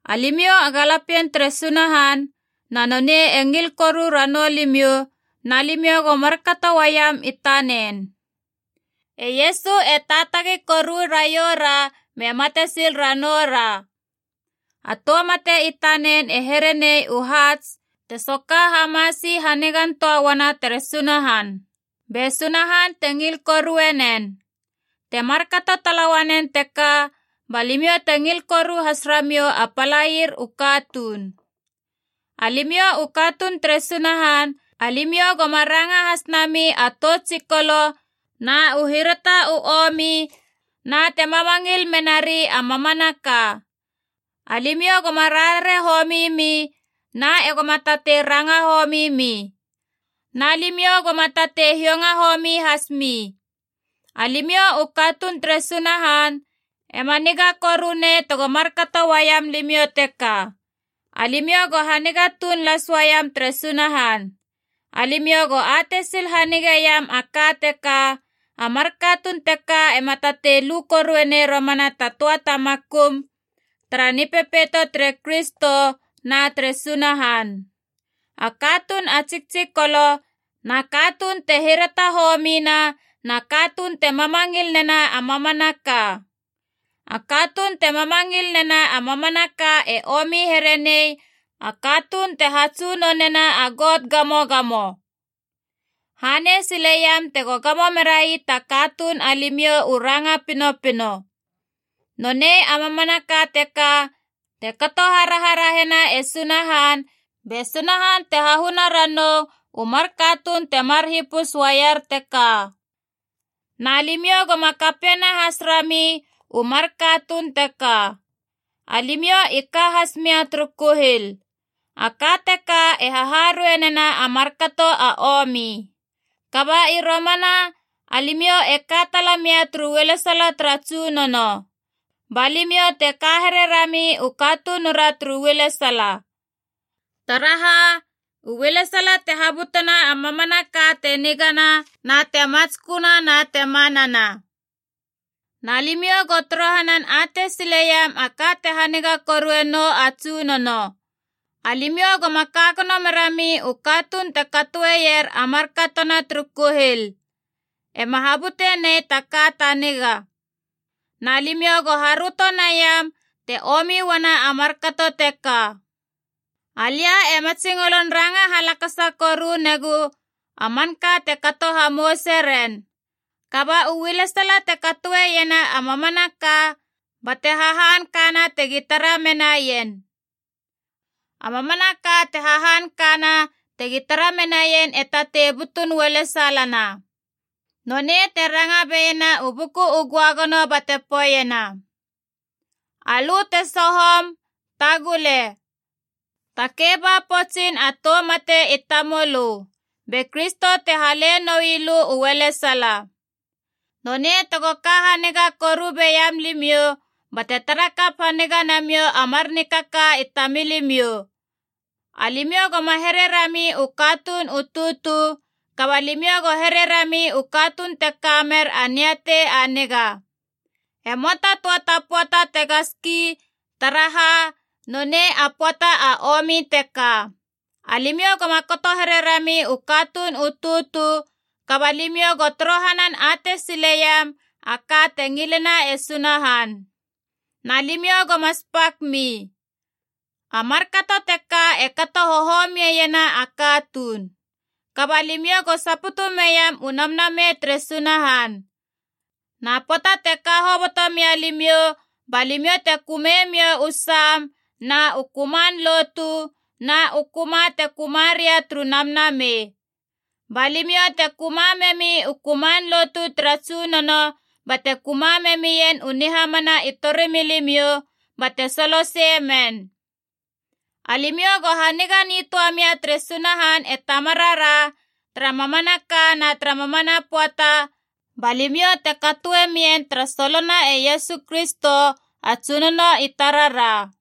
Alimiou a galapien tere Sunahan na nonei e ngil koru ranou limiou na limiou go markato uaiam i tanen. E Iesu e taatagi koru raioura me mate sil ranoura. A tou mate i tanen e here nei u haats te soka hamasi hanigan töa uana tere Sunahan, be Sunahan te ngil korue nen. Te markato tala uanen teka ba limiou te ngil koru has ramiou a palaier u katuun. Alimiou u katuun tere Sunahan alimiou goma ranga has nami a tou tsikolo na u hirata u omi na te mamangil menari a mamanaka. Alimiou goma rarare homi mi na e goma tatei ranga homi mi. Na limiou goma tatei hiounga homi hasmi. Alimiou u katuun tere Sunahan, ema niga koru nei tego markato uaiam limiou teka. Alimiou go haniga tuun las uaiam tere Sunahan. Alimiou go atei sil hanigeiam a ka teka, a mar katuun teka ema tatei lu korue nei romana ta töa ta makum tara Nipepeito tere Kristo na tere Sunahan: a katuun a tsiktsikolo na katuun te hirata homina na katuun te mamangil nena a mamanaka. A katuun te mamangil nena a mamanaka e omi here nei a katuun te hatsunonena a got gamogamo. Hanei sileiam tego gamo merai ta katuun alimiou u ranga pinopino. Nonei a mamanaka teka te kato haraharahena e Sunahan, be Sunahan te hahuna ranou u mar katuun temar hipus uaier teka. Na limiou goma kapiena has rami u mar katuun teka. Alimiou i ka has mia turu kuhil. A ka teka e haharuei nena a markato a omi. Kaba i romana alimiou e ka tala mia turu ualesala tara Tsunono. Ba limiou te ka here rami u katunura turu ualesala. Taraha, u ualesala te habutena a mamanaka te nigana na te matsköna na te manana. Na limiou go torohanan atei sileiam a ka te haniga korue nou a Tsunono. Alimiou goma ka gono merami u katuun te katoeier a markatona turu kuhil. E ma habute nei ta ka ta niga. Na limiou go haröto naiam te omi uana a markato teka. Alia e matsingolon ranga halakasa koru negu a manka te kato hamouse ren. Kaba u ualesala te katoeiena a mamanaka bate hahankana tegi tara menaien. A mamanaka te hahankana tegi tara menaien e tatei butun ualesalana. Nonei te ranga beiena u Buku u Göagono bate poeiena: “Alö te sohom, tagule! Takei ba poutsin a tou mate i tamölö. Be Kristo te hale noi lö u ualesala.” Nonei tego ka haniga koru beiam limiou bate tara kap haniga namiou a mar nikaka i tamilimiou. Alimiou goma here rami u katuun u tutu, kaba limiou go here rami u katuun te ka mer a niatei a niga. E möa ta töa ta pöata tega ski, taraha nonei a pöata a omi teka. Alimiou goma kato here rami u katuun u tutu, kaba limiou go torohanan atei sileiam a ka te ngilena e Sunahan. Na limiou goma spak mi. A markato teka e kato hohomiena a katuun. Kaba limiou go saputu meiam u Namnamei tere Sunahan. Na pöata te ka hoboto mia limiou ba limiou te kömemiou u sam na u köman lotu na u köma te köma ria turu namnamei. Ba limiou te köma memi u köman lotu tara Tsunono bate köma memien u nihamana i torimilimiou bate soloseie men. Alimiou go haniga nitöa mia tere Sunahan e Tamarara, tara mamanaka na tara mamana pöata, ba limiou te katoe mien tara solona e Iesu Kristo a Tsunono i tarara.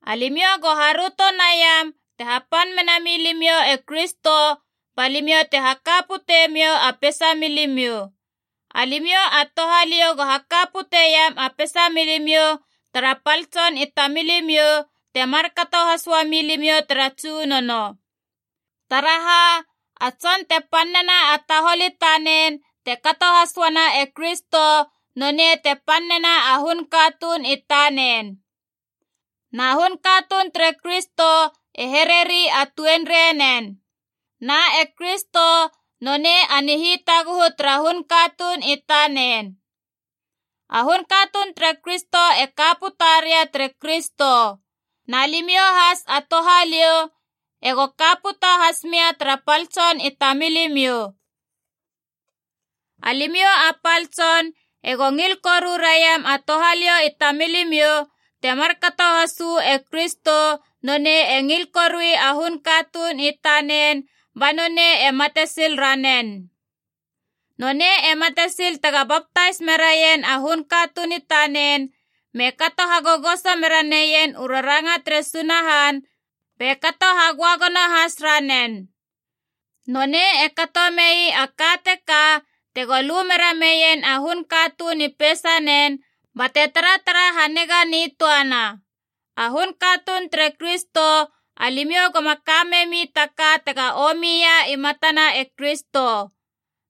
Alimiou go haröto naiam te hapan mena milimiou e Kristo ba limiou te haka putemiou a peisa milimiou. Alimiou a touhaliou go haka puteiam a peisa milimiou tara pal tson i tamilimiou, te markato has uami limiou tara Tsunono. Taraha, a tson te pan nena a tahol i tanen te kato has uana e Kristo nonei te pan nena a hun katuun i tanen. Na hun katuun tere Kristo e hereri a tuenrei nen. Na e Kristo nonei a Nihitaguhu tara hun katuun i tanen. A hun katuun tere Kristo e ka puta ria tere Kristo. Na limiou has a touhaliou ego ka puta has mia tara pal tson i tamilimiou. Alimiou a pal tson ego ngil koru raiam a touhaliou i tamilimiou, te markato has uu e Kristo nonei e ngil korui a hun katuun i tanen ba nonei e mate sil ranen. Nonei e mate sil tega baptais meraien a hun katuun i tanen, me kato hagogoso mera neien u raranga tere Sunahan, be kato hagöagono has ranen. Nonei e kato mei a ka teka tego lu mera meien a hun katuun i peisanen bate taratara haniga nitöana. A hun katuun tere Kristo alimiou goma ka memi ta ka tega omia i matana e Kristo.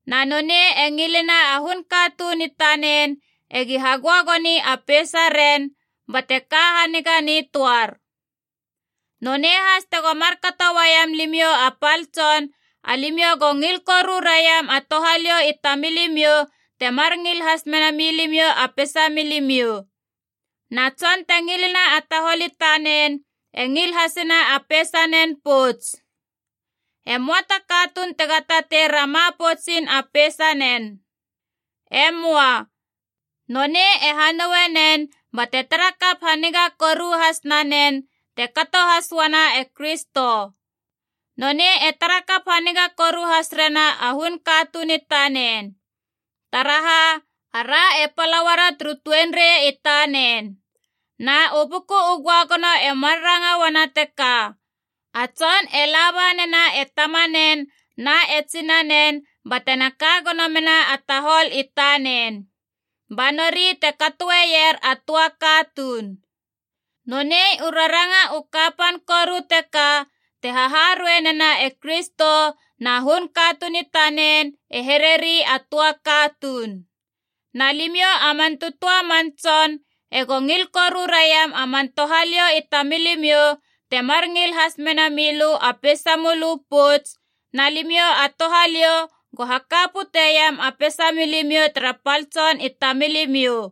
Na nonei e ngilena a hun katuun i tanen egi hagöagoni a peisa ren bate ka haniga nitöar. Nonei has tego markato uaiam limiou a pal tson, alimiou go ngil koru raiam a touhaliou i tamilimiou temar ngil has mena milimiou a peisa milimiou. Na tson te ngilena a tahol i tanen e ngil hasena a peisanen pouts. E möa ta katuun tega tatei rama poutsin a peisa nen. E möa. Nonei e hanoue nen bate tara kap haniga koru has nanen, te kato has uana e Kristo. Nonei e tara kap haniga koru has rena a hun katuun i tanen. Taraha, ara e pala uara turu tuenrei i tanen. Na u Buku u Göagono e mar ranga uana teka, a tson e la ba nena e tamanen na e tsinanen batena ka gono mena a tahol i tanen. Ba nori te katoeier a töa katuun. Nonei u raranga u kapan koru teka te haharueina nena e Kristo na hun katuun i tanen e hereri a töa katuun. Na limiou a man tötöa a man tson ego ngil koru raiam a man touhaliou i tamilimiou, temar ngil has mena milö a peisa mölö pouts, na limiou a touhaliou go haka puteiam a peisa milimiou tara pal tson i tamilimiou.